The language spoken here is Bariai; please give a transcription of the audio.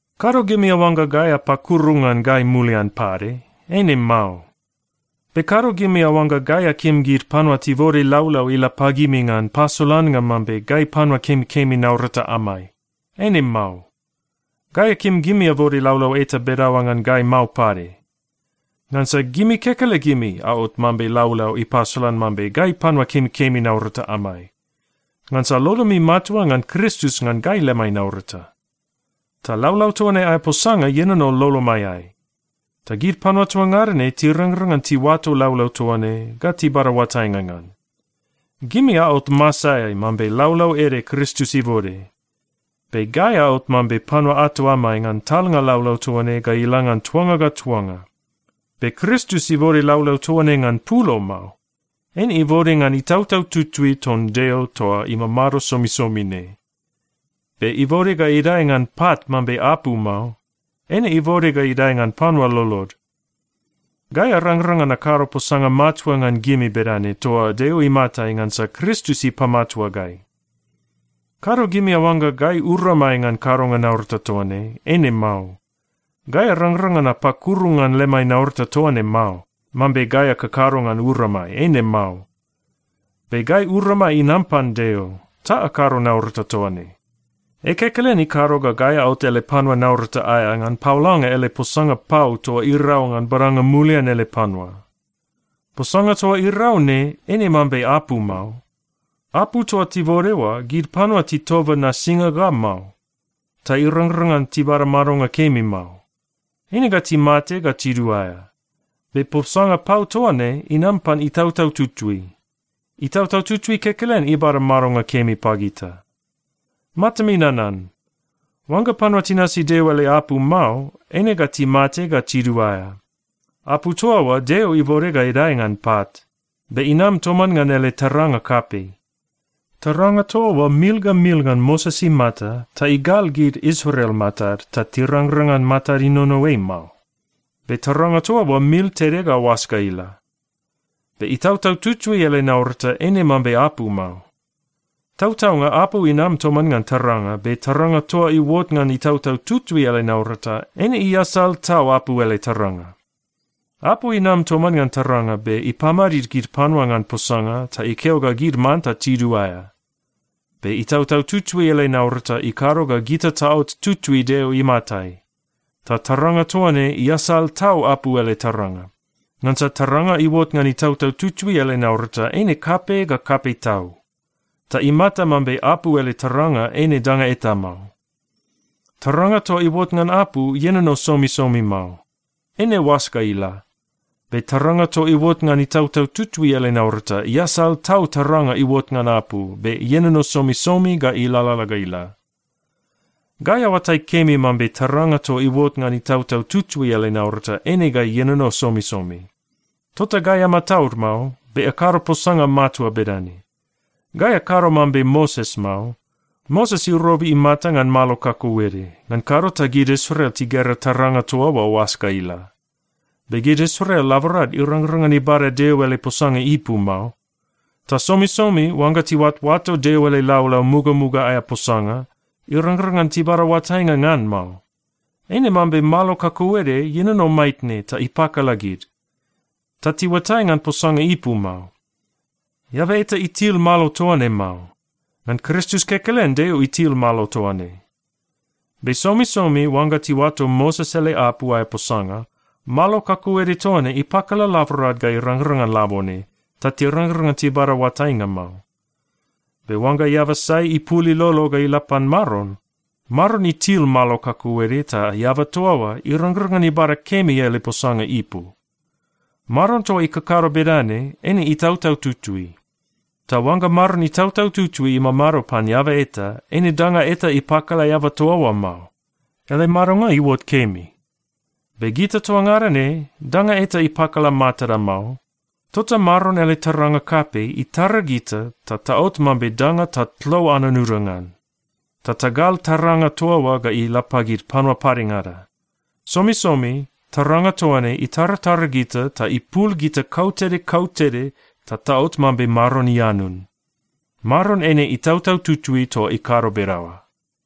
Kado gimi aoangga gai apakuru ngan gai mulian pade? Eine mao. Be kado gimi aoangga gai akim gid panua tibode laulau ila pagimi ngan pasolannga mambe gai panua kemikemi naurata amai. Eine mao. Gai akim gimi abode laulau eta bedaoa ngan gai mao pade. Ngansa gimi kekelegimi aot mambe laulau ipasolan mambe gai panua kemikemi naurata amai, ngansa lolomi matua ngan Kristus ngan gai lemai naurata. Ta laulau toa ne aea posanga ienono lolomaiai. Ta gid panua toa ngada ne tirangrang ngan tiuato laulau toa ne ga tibada oatainga ngan. Gimi aot masaeai mambe laulau ede Kristus ibode. Be gai aot mambe panua ato amai ngan talnga laulau toa ne ga ila ngan tuanga ga tuanga. Be Kristus ibode laulau toa ne ngan pulo mao. Eine ibode ngan Itautau Tutui ton Deo toa imamado somisomi ne. Be ibode ga idae ngan pat mambe apu mao. Eine ibode ga idae ngan panua lolod. Gai arangrang ngan akado posanga matua ngan gimi bedane toa Deo imatai ngansa Kristus ipamatua gai. Kado gimi aoangga gai uramai ngan kadonga naurata toa ne. Eine mao. Gai arangrang ngan apakuru ngan lemai naurata toa ne mao, mambe gai akakado ngan uramai. Eine mao. Be gai uramai inam pan Deo, ta akado naurata toa ne. Ei kekelen ikado ga gai aot ele panua naurata aea, ngan paolanga ele posanga pau toa irau ngan badanga mulian ele panua. Posanga toa irau ne eine mambe apu mao. Apu toa tibode oa, gid panua titoba nasinga ga mao, ta irangrang ngan tibada madonga kemi mao. Eine ga timate ga tiduaea. Be posanga pau toa ne inam pan Itautau Tutui. Itautau Tutui kekelen ibada madonga kemi pagita. Matami nanan. Oangga panua tinasi Deo ele apu mao, eine ga timate ga tiduaea. Apu toa oa Deo ibode ga idae ngan pat, be inam toman ngan ele taranga kapei. Taranga toa oa mil ga mil ngan Moses imata ta igal gid Israel matad, ta tirangrang ngan matad inono ei mao. Be taranga toa oa mil tede ga oas ga ila. Be Itautau Tutui ele naurata eine mambe apu mao. Tautaunga apu inam toman ngan taranga, be taranga toa iuot ngan Itautau Tutui ele naurata, eine iasal tau apu ele taranga. Apu inam toman ngan taranga, be ipamadid gid panua ngan posanga ta ikeo ga gid manta tiduaea. Be Itautau Tutui ele naurata ikado ga gita taot tutui Deo imatai, ta taranga toa ne iasal tau apu ele taranga. Ngansa taranga iuot ngan Itautau Tutui ele naurata eine kapei ga kapei tau. Ta imata mambe apu ele taranga eine danga eta mao. Taranga toa iuot ngan apu, ienono somisomi mao. Eine oas ga ila. Be taranga toa iuot ngan Itautau Tutui ele naurata iasal tau taranga iuot ngan apu, be ienono somisomi ga ilalala ga ila. Gai aoatai kemi mambe taranga toa iuot ngan Itautau Tutui ele naurata eine ga ienono somisomi. Tota gai amataud mao, be akado posanga matua bedane. Gai akado mambe Moses mao. Moses irobi imata ngan malo kakauede, ngan kado ta gid Israel tigera taranga toa oa oas ga ila. Be gid Israel laborad irangrang ngan ibada Deo ele posanga ipu mao. Ta somisomi oangga tiuatoato Deo ele laulau mugamuga aea posanga, irangrang ngan tibada oatainga ngan mao. Eine mambe malo kakauede ienono maitne ta ipakala gid, ta tiuatai ngan posanga ipu mao. Eaba eta itil malo toa ne mao. Ngan Kristus kekelen Deo itil malo toa ne. Be somisomi oangga tiuato Moses ele apu aea posanga, malo kakauede toa ne ipakala laborad ga irangrang ngan labone, ta tirangrang ngan tibada oatainga mao. Be oangga eaba sai ipul ilolo ga ila pan Maron, Maron itil malo kakauede ta eaba toa oa irangrang ngan ibada kemi ele posanga ipu. Maron toa ikakado bedane, eine Itautau Tutui. Ta oangga Maron Itautau Tutui imamado pan eaba eta, eine danga eta ipakala eaba toa oa mao. Ele madonga iuot kemi. Be gita toa ngada ne, danga eta ipakala matada mao. Tota Maron ele taranga kapei itara gita ta taot mambe danga tatlo anunuda ngan, ta tagal taranga toa oa ga ila pagid panua padengada. Somisomi taranga toa ne itaratara gita ta ipul gita kautede kautede ta taot mambe Maron ianun. Maron eine Itautau Tutui toa ikado bedaoa.